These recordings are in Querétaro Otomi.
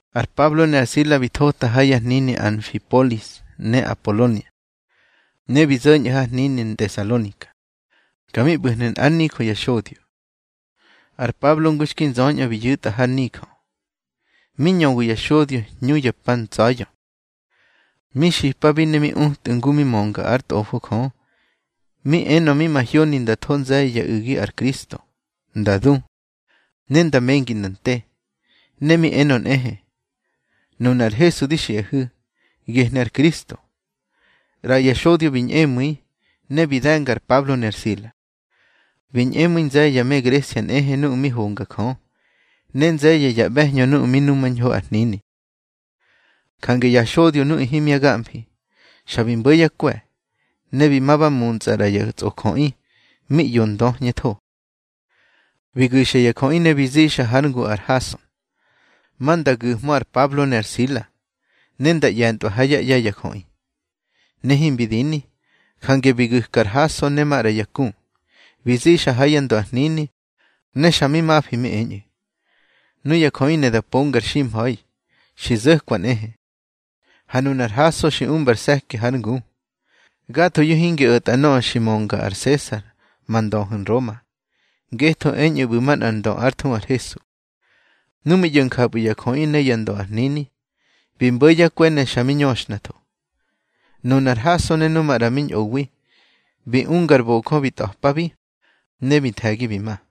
Ar Pablo ne ar Sila bi thota ha ya hnini Anfipoli ne Apolonia, ne bi zo̱ñꞌu̱ har hnini Ntesalonika. Ka mi ꞌbu̱hnu̱ nꞌár nijö ya xodyo. Ar Pablo ngu xki nzöñꞌö bi yu̱tꞌa har nijö, mi ñöwi ya xodyo hñu ya pa ntsa̱ya̱. Mi xipabi ne mi utꞌu̱ ngu mi mönga ár Tꞌofo Jö. Mi enö mi mahyoni nda tho nze̱ye̱ ya u̱gi ar Kristo, nda du, ne nda mengi nda nte. Ne mi enö nꞌehe: —Nuna ar Hesu di xiꞌahu̱, gehnu̱ ar Kristo. ꞌRaya xodyo bi ñꞌemu̱i, ne bi de̱nga ar Pablo ne ar Sila. Bi ñꞌemu̱i nze̱ye̱ ya me Gresia nꞌehe nuꞌu̱ mi honga Jö, ne nze̱ye̱ ya ꞌbe̱hñö nuꞌu̱ mi numañho ar hnini. Jange ya xodyo nuꞌu̱ himya gamfi, xa bi mbo̱ yá kwe̱, ne bi ma ba muntsꞌa ꞌra ya tsꞌojöꞌi mi ꞌyo döhñetho. Bi gu̱xa ya jöꞌi ne bi zixa hár ngu ar Hason, ma nda gu̱jhmö ar Pablo ne ar Sila, ne nda ꞌye̱ntꞌwa ha yá ꞌye̱ ya jöꞌi. Ne himbi dini, jange bi gu̱ka ar Hason ne maꞌra ya ku, bi zixa ha yá ndö ar hnini, ne xa mi mafi mi eñꞌu̱: —Nuya jöꞌi ne da pongar ximha̱i, xi zo̱kwa nꞌehe. Ha nunar Hason xi umbar se̱ki hár ngu. Gathoyu̱ hingi o̱ta nöꞌö xi möngar Sesar ma ndöhu̱ Nroma, ngetho eñꞌu̱ ꞌbu̱ manꞌar ndö ár thuhu ar Hesu. Nu mi ꞌyo̱ njapꞌu̱ ya jöꞌi ne yá ndö ar hnini, bi mbo̱ yá kwe̱ ne xa mi ñöxhnatho. Nunar Hason ne nu maꞌra mi ñꞌowi, bi unga ar bojö mi tꞌa̱pabi, ne bi nthe̱gi bi ma.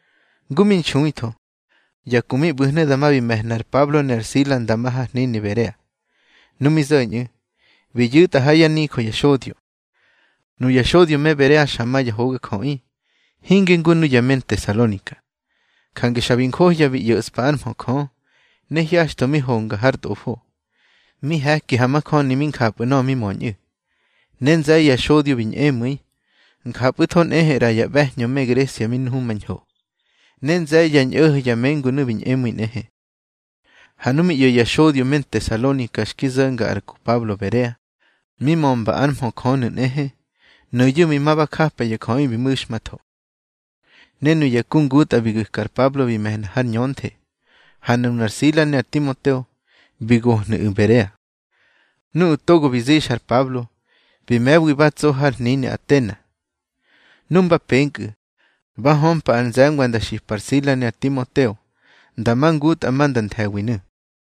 Ngu mi nxuitho, ya ku mi ꞌbu̱hnu̱ dama bi me̱hna ar Pablo ne ar Sila nda ma har hnini Berea. Nu mi zo̱ñꞌu̱, bi yu̱tꞌa ha yá nijö ya xodyo. Nuya xodyo me Berea xa ma ya hogajöꞌi, hinge ngu nuya me Ntesalonika. Jange xa bi njohya bi ꞌyo̱ꞌspa ár mhö Jö, ne hyaxtho mi honga har Tꞌofo, mi he̱ki ha majöni mi njapꞌu̱ nöꞌö mi möñꞌu̱. Ne nze̱ye̱ ya xodyo bi ñꞌemu̱i, njapꞌu̱tho nꞌehe ꞌra ya ꞌbe̱hñö me Gresia mi nhumahño. Ne nze̱ye̱ ya ñꞌo̱ho̱ ya mengunu̱ bi ñꞌemu̱i nꞌehe. Ha nu mi ꞌyo̱ ya xodyo me Ntesalonika xki zo̱nga ar ku Pablo Berea, mi mömba ár mhö Jö nu̱ nꞌehe, nuyu̱ bi ma ba japa ya jöꞌi bi mu̱xmatho. Ne nuya ku ngutꞌa bi gu̱ka ar Pablo bi me̱hna har ñönthe, ha nunar Sila ne ar Timoteo bi gohnu̱ꞌu̱ Berea. Nuꞌu̱ togo bi zixa ar Pablo, bi me̱wi ba tso har hnini Atena. Nu mba penkꞌu̱, ba hömpa ar nze̱ngwa nda xipa ar Sila ne ar Timoteo nda ma ngutꞌa ma nda nthe̱winu̱.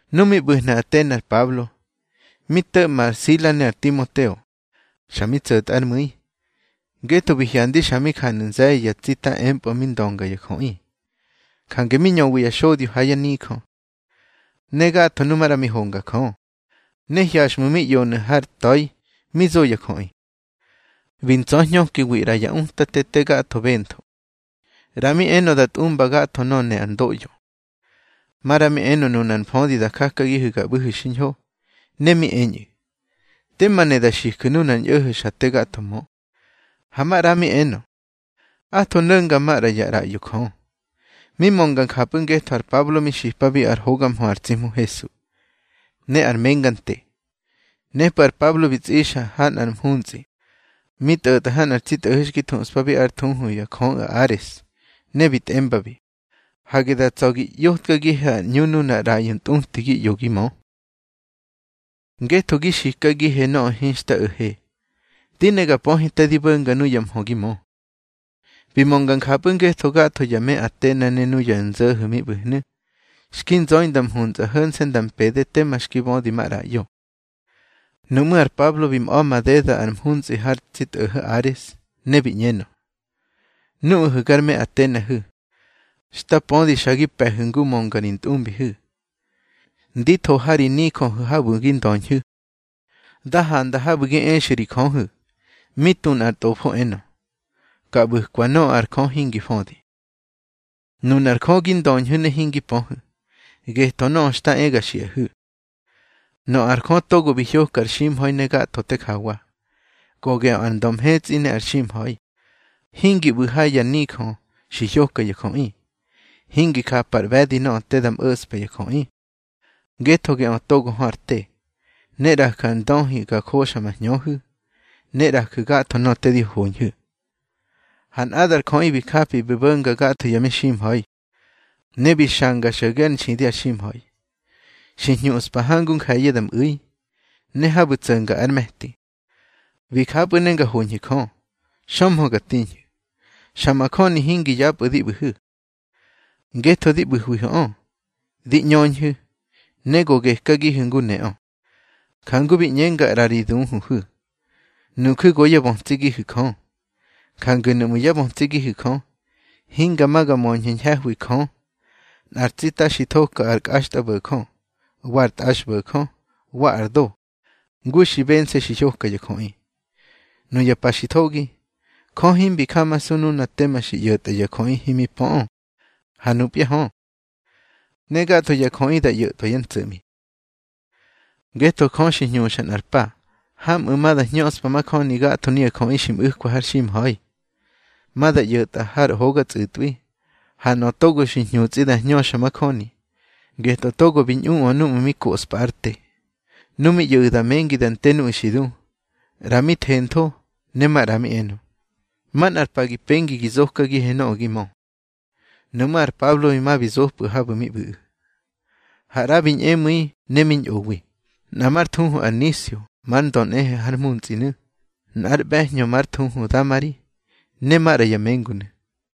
Nu mi ꞌbu̱hnu̱ Atena ar Pablo, mi to̱ꞌma ar Sila ne ar Timoteo, xa mi tso̱tꞌa ár mu̱i, ngetho bi hyandi xa mi janu̱ nze̱ye̱ ya tsita empꞌö mi ndönga ya jöꞌi. Jange mi ñöwi ya xodyo ha yá nijö, ne gatho nu maꞌra mi honga Jö, ne hyaxtho mi ꞌyonu̱ har ta̱i mi zo ya jöꞌi. Bi ntsa̱hñökiwi ꞌra ya utate te gatho bentho. ꞌRa mi enö da tꞌumba gatho nöꞌö ne ár ndoꞌyo, maꞌra mi enö nunar mfödi da jakagihu̱ ga ꞌbu̱hu̱ xiñho. Ne mi eñꞌu̱: —Tema ne da xiju̱ nunar ñꞌo̱ho̱ xa te gatho mö. Ha maꞌra mi enö: —Atho no̱nga maꞌra ya ꞌraꞌyo jö. Mi mönga njapꞌu̱ ngetho ar Pablo mi xipabi ár hoga mhö ar tsi Hmu Hesu, ne ar menga nte. Nepꞌu̱ bi tsꞌixa ar Pablo ha nꞌar mhuntsꞌi mi tꞌo̱tꞌa har nꞌar tsi tꞌo̱ho̱ xki thuꞌspa ár thuhu yá jöꞌu̱ Ares. Ne bi tꞌembabi: —Hage da tsa̱ gi ꞌyotkagihe ar ꞌñu nunar ꞌraꞌyo ntꞌuti gi ꞌyo gi mö. Ngetho gi xikagihe nöꞌö hinxta o̱he. Di ne ga pöhe te di bo̱nga nuya mhö gi mö. Bi mönga njapꞌu̱ ngetho gatho ya me Atena ne nuya nzo̱ho̱ mi ꞌbu̱hnu̱, xki nzöi nda mhuntsꞌi ho̱nse̱ nda mpede tema xki bödi maꞌraꞌyo. Nuꞌmú̱ ar Pablo bi mꞌa̱ madeda ar mhuntsꞌi har tsi tꞌo̱ho̱ Ares, ne bi ꞌñenö: —Nuꞌahu̱ gar me Atenahu̱, xta pödi xa gi pe̱hu̱ ngu mönga ri ntꞌumbihu̱. Ndi tho ha ri nijöhu̱ habu̱ gi ndöñhu̱, da handa habu̱ gi exu̱ ri jöhu̱, mi tu nꞌar ntꞌofo enö: Ka ꞌbu̱kwa nöꞌö ar Jö hingi födi. Nunar Jö gi ndöñhu̱ ne hingi pöhu̱, getꞌö nöꞌö xta e ga xiꞌahu̱. Nöꞌö ar Jö togo bi hyoka ar ximha̱i ne gatho te jawa, go geꞌö ar ndö mhetsꞌi ne ar ximha̱i, hingi ꞌbu̱ ha ya nijö xi hyoka ya jöꞌi. Hingi japar ꞌbe̱di nöꞌö te da mo̱ꞌspa ya jöꞌi, ngetho geꞌö togo hö ar te, ne ꞌraju̱ ar ndöhi ga joxa ma hñöhu̱, ne ꞌraju̱ gatho nöꞌö di hoñhu̱. Ha nꞌadar jöꞌi bi japi bi bo̱nga gatho ya meximha̱i, ne bi xanga xo̱ge ár nxidi ar ximha̱i. Xi hñuꞌspa hangu nje̱ye̱ da mꞌu̱i, ne habu̱ tso̱nga ár me̱ti. Bi japꞌu̱ ne nga hoñhu̱ Jö, xömhö ga tiñhu̱, xa majöni hingi yapꞌu̱ di ꞌbu̱hu̱. Ngetho di ꞌbu̱hwihu̱ꞌö, di ꞌñöñhu̱, ne go gekagihu̱ ngu neꞌö. Jangu bi ꞌñenga ꞌra ri duhuhu̱: Nuju̱ go yá bötsigihu̱ Jö. Jange nuꞌmu̱ yá bötsigihu̱ Jö, hinga ma ga möñhu̱ ñhe̱hwi Jö nꞌar tsita xi thoka ar kꞌaxtꞌabo̱jö, wa ar tꞌaxbo̱jö, wa ar do, ngu xi bense̱ xi hyoka ya jöꞌi. Nuya pa xi thogi, Jö himbi jamasu nuna tema bi ꞌyo̱tꞌa ya jöꞌi himi pöꞌö. Ha nupya hö, ne gatho ya jöꞌi da ꞌyo̱tꞌwa yá ntso̱ꞌmi. Ngetho Jö xi hñuxa nꞌar pa hamꞌu̱ ma da hñöꞌspa majöni gatho nuya jöꞌi xi mꞌu̱kwa har ximha̱i, ma da ꞌyo̱tꞌa har hoga tsꞌutꞌwi. Ha nöꞌö togo xi hñutsꞌi da hñöxa majöni, getꞌö togo bi ñꞌuꞌö núꞌmu̱ mi koꞌspa ár te. Nu mi ꞌyo̱ꞌu̱ da mengi da nte nuꞌu̱ xi du, ꞌra mi thentho ne maꞌra mi enö: —Manꞌar pa gi pengi gi zokagihe nöꞌö gi mö. Nuꞌmú̱ ar Pablo bi ma bi zopꞌu̱ habu̱ mi ꞌbu̱ꞌu̱. Ha ꞌra bi ñꞌemu̱i ne mi ñꞌowi, nꞌa már thuhu ar Nisio mar ndö nꞌehe har mhuntsꞌinu̱, nꞌar ꞌbe̱hñö már thuhu Damari, ne maꞌra ya mengunu̱.